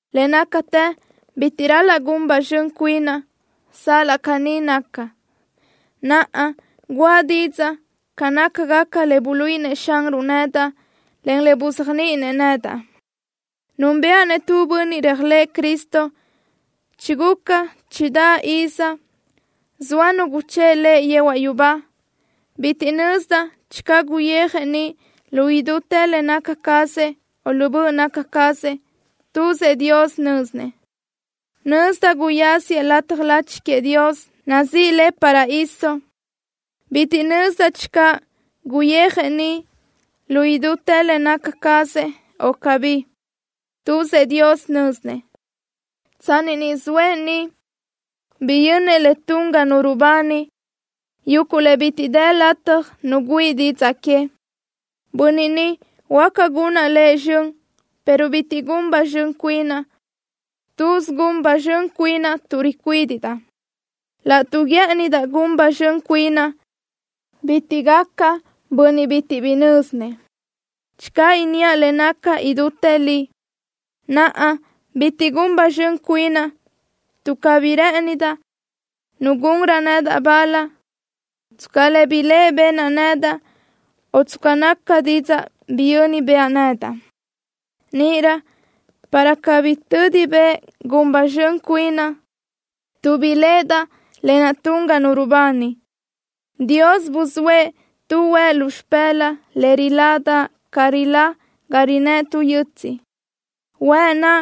Le nácatë bitiʼ ral-laʼ gun ba zxön cuinaʼ. Sal-laʼ caní naca, naʼa guʼa didzaʼ ca nácagaca le buluíʼinëʼ Xanruʼ nedaʼ, en le buzéajniʼinëʼ nedaʼ. Núnbëʼa-nëʼ tu bönniʼ réajlëʼë Cristo, chiguca chidáʼ iz zoa nu guchë́ʼ lëʼ yehuaʼ yubá. Bitiʼ nözdaʼ channö guyijëʼ niʼ lu idútë le naca cazëʼ, o lu böʼ naca cazëʼ. Tuzëʼ Dios nö́zinëʼ. Nözdaʼ guyáziëʼ lataj lachi queëʼ Dios, nazíʼi le paraíso. Bitiʼ nözdaʼ channö guyijëʼ niʼ lu idútë le naca cazëʼ, o cabí. Tuzëʼ Dios nö́zinëʼ. Tsanni niʼ zoëʼ ga naʼ, biyönnëʼ le tun ga nu rubani, yuguʼ le bitiʼ dë lataj nu güíʼi didzaʼ que. Bönniʼ ni huáca gunaʼ lëʼ zxön, pero bitiʼ gun ba zxön cuinaʼ. Tuz gun ba zxön cuinaʼ tuʼ ricuídiʼdaʼ. Laʼtuʼ guë́ʼënidaʼ gun ba zxön cuinaʼ, bitiʼ gacaʼ bönniʼ bitiʼ bi nö́zinëʼ, channö inníaʼ le naca idútë li. Naʼa, bitiʼ gun ba zxön cuinaʼ tuʼ cabí rë́ʼëndaʼ nu gunrö nedaʼ bal tsca le biléʼe benaʼ nedaʼ, o tsca naca didzaʼ biyö́ni bëʼa nedaʼ. Níʼirö, para cabí tödi bëʼ gun ba zxön cuinaʼ tuʼ biléʼedaʼ lë naʼ tun ga nu rubani, Dios buzóëʼ tu huëʼ lu xipë́laʼa le riládaʼ ca rilá ga rinë́ʼ tu yötsiʼ. Huëʼ naʼ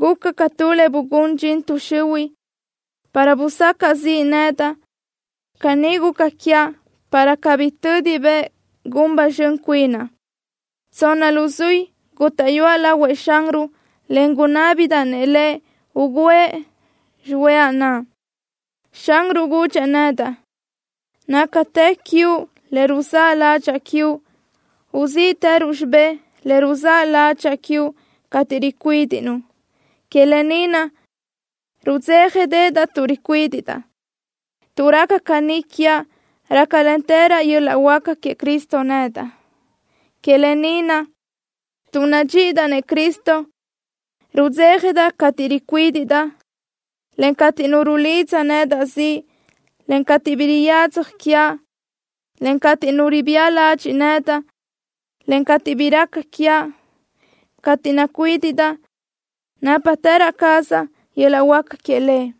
guca ca tu le bugún dxin tuʼ xihuiʼ, para busacaʼ ziʼ nedaʼ. Caní guca quiaʼ para cabí tödi bëʼ gun ba zxön cuinaʼ. Tsonna luzuí gútaʼyuaʼ lahuëʼ Xanruʼ, en gunábidaʼ Lëʼ ugǘëʼ xihuëʼa naʼ. Xanruʼ gudxëʼ nedaʼ: “Nácatë quiuʼ le ruzáʼ ládxaʼa quiuʼ. Uzíʼtëruʼ xibé le ruzáʼ ládxaʼa quiuʼ cateʼ ricuídiʼnuʼ.” Que lë ni naʼ, rudzéjadeʼedaʼ tuʼ ricuídiʼdaʼ. Tuʼ raca caní quiaʼ, rácalentërö yöl-laʼ huáca queëʼ Cristo nedaʼ. Que lë ni naʼ, tuʼ nadxíʼidaʼ-nëʼ Cristo, rudzéjadaʼ cateʼ ricuídiʼdaʼ, en cateʼ nu rulidza nedaʼ ziʼ, en cateʼ bi riyadzaj quiaʼ, en cateʼ nu ribía ladxiʼ nedaʼ, en cateʼ bi raca quiaʼ. Cateʼ nacuídiʼdaʼ, nápatërö cazaʼ yöl-laʼ huáca queëʼ Lëʼ.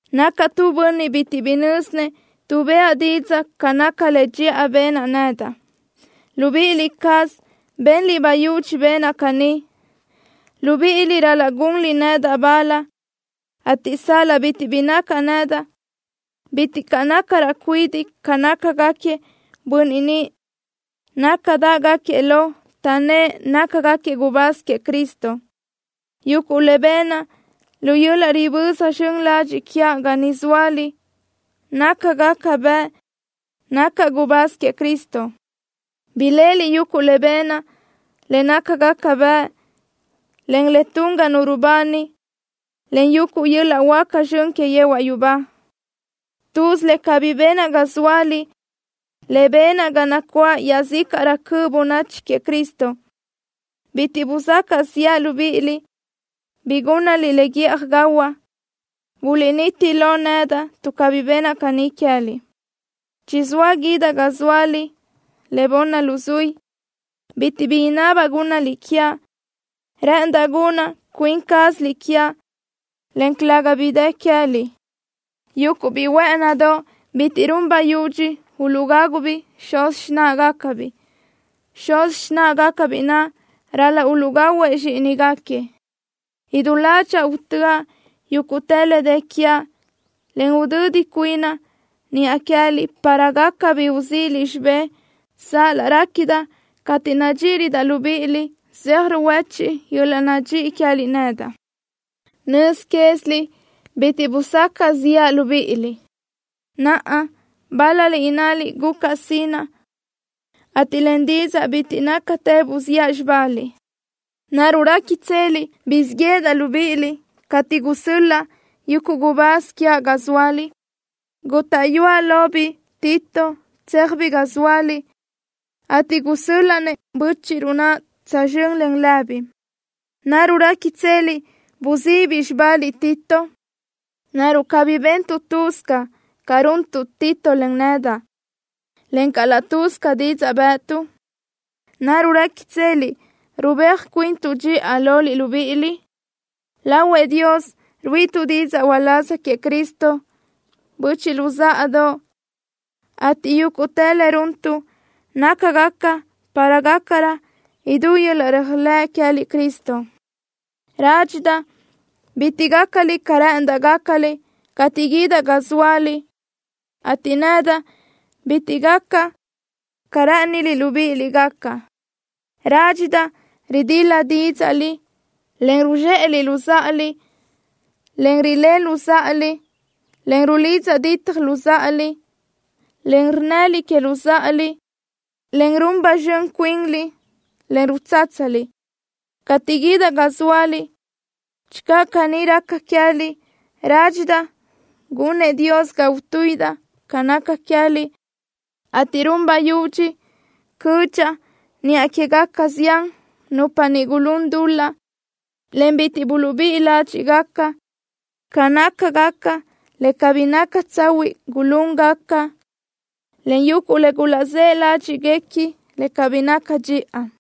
Nacaʼ tu bönniʼ bitiʼ bi nö́zinëʼ tuʼ bëʼa didzaʼ ca naca le dxiʼa benaʼ nedaʼ. Libíʼi cázaliʼ benliʼ bayudxi benaʼ caní. Libíʼiliʼ ral-laʼ gunliʼ nedaʼ bal, ateʼ sal-laʼ bitiʼ bi nacaʼ nedaʼ, bitiʼ caʼ nácaraʼ cuidiʼ ca nácagaquiëʼ bönniʼ niʼ nácadaʼgaquiëʼ lo, taʼnnë́ʼ nácagaquiëʼ gubáz queëʼ Cristo. Yuguʼ le benaʼ lu yöl-laʼ riböza zxön ladxiʼ quiaʼ ga niʼ zóaliʼ nácagaca bëʼ nacaʼ gubáz queëʼ Cristo. Biléʼeliʼ yuguʼ le benaʼ, le nácagaca bëʼ, en le tun ga nu rubani, en yuguʼ yöl-laʼ huáca zxön que yehuaʼ yubá. Tuz le cabí benaʼ ga zóaliʼ le benaʼ ga nacuáʼ iaʼzícaʼrö cöʼ bönachi queëʼ Cristo. Bitiʼ busacaʼ ziʼa libíʼiliʼ bi gúnnaliʼ le guíʼaj gahuaʼ. Buliʼniti lo nedaʼ tuʼ cabí benaʼ caní queë́liʼ. Chizóa guídaʼ ga zóaliʼ le bunni luzuí. Bitiʼ bi inabaʼ gúnnaliʼ quiaʼ. Rë́ʼëndaʼ gunna cuin cázaliʼ quiaʼ, en calëga bi dë queë́liʼ. Yuguʼ biʼi huë́ʼënidoʼ, bitiʼ run bayudxi uluʼgágubiʼ xuz xináʼagacabiʼ. Xuz xináʼagacabiʼ naʼ ral-laʼ uluʼgahuëʼ zxíʼinigaquiëʼ. Idú ládxaʼa utö́aʼ yúguʼtë le dë quiaʼ, en udödi cuinaʼ niʼa queë́liʼ para gaca bi uzíʼiliʼ xibé, sal-laʼ réquidaʼ cateʼ nadxíʼirödaʼ libíʼiliʼ, zeaj ruhuéchiʼ yöl-laʼ nadxíʼi queë́liʼ nedaʼ. Nöz quéziliʼ bitiʼ busacaʼ ziʼa libíʼiliʼ. Naʼa, bál-laliʼ innaliʼ gucaʼ sinaʼ, ateʼ len didzaʼ bitiʼ nácatë buziʼa xibaliʼ. ¿Naruʼ réquitseliʼ guzxíʼ yéʼedaʼ libíʼiliʼ cateʼ gusö́l-laʼa yuguʼ gubáz quiaʼ ga zóaliʼ? Gútaʼyuaʼ lobiʼ biʼi Tito tséajbiʼ ga zóaliʼ, ateʼ gusö́l-laʼa-nëʼ bö́chiʼruʼ naʼ tsözxö́n len lëbiʼ. ¿Naruʼ réquitseliʼ buzíʼibiʼ xibaliʼ biʼi Tito? ¿Naruʼ cabí bentuʼ laʼ lë́bisö ca runtuʼ biʼi Tito, en nedaʼ, encaʼ laʼ lë́bisö didzaʼ bë́ʼëtuʼ? ¿Naruʼ réquitseliʼ rubéaj cuintuʼ dxiʼa loliʼ libíʼiliʼ? Lahuëʼ Dios ruíʼituʼ didzaʼ uláz queëʼ Cristo, böchiʼ luzáʼadoʼ, ateʼ yúguʼtë le runtuʼ nácagaca para gácarö idú yöl-laʼ réajlëʼ queë́liʼ Cristo. Rádxidaʼ bitiʼ gácaliʼ ca rë́ʼëndaʼ gácaliʼ cateʼ guídaʼ ga zóaliʼ, ateʼ nedaʼ bitiʼ gacaʼ ca rë́ʼëniliʼ libíʼiliʼ gacaʼ. Rádxidaʼ ridil-la dídzaʼliʼ, en ruzxéʼeliʼ luzáʼaliʼ, en rileliʼ luzáʼaliʼ, en rulidza dítjaliʼ luzáʼaliʼ, en rnnëliʼ que luzáʼaliʼ, en run ba zxön cuinliʼ, en rutsátsaliʼ. Cateʼ guídaʼ ga zóaliʼ, channö caní raca queë́liʼ, rádxidaʼ gunëʼ Dios ga utuíʼidaʼ ca naca queë́liʼ, ateʼ gun bayudxi cödxaʼ niʼa quégaca zián nupa niʼ gulún dul-laʼ, en bitiʼ buluʼbíʼi ládxiʼgaca ca nácagaca le cabí naca tsahuiʼ gulúngaca, en yuguʼ le gulaʼzë́ ládxiʼguequi le cabí naca dxiʼa.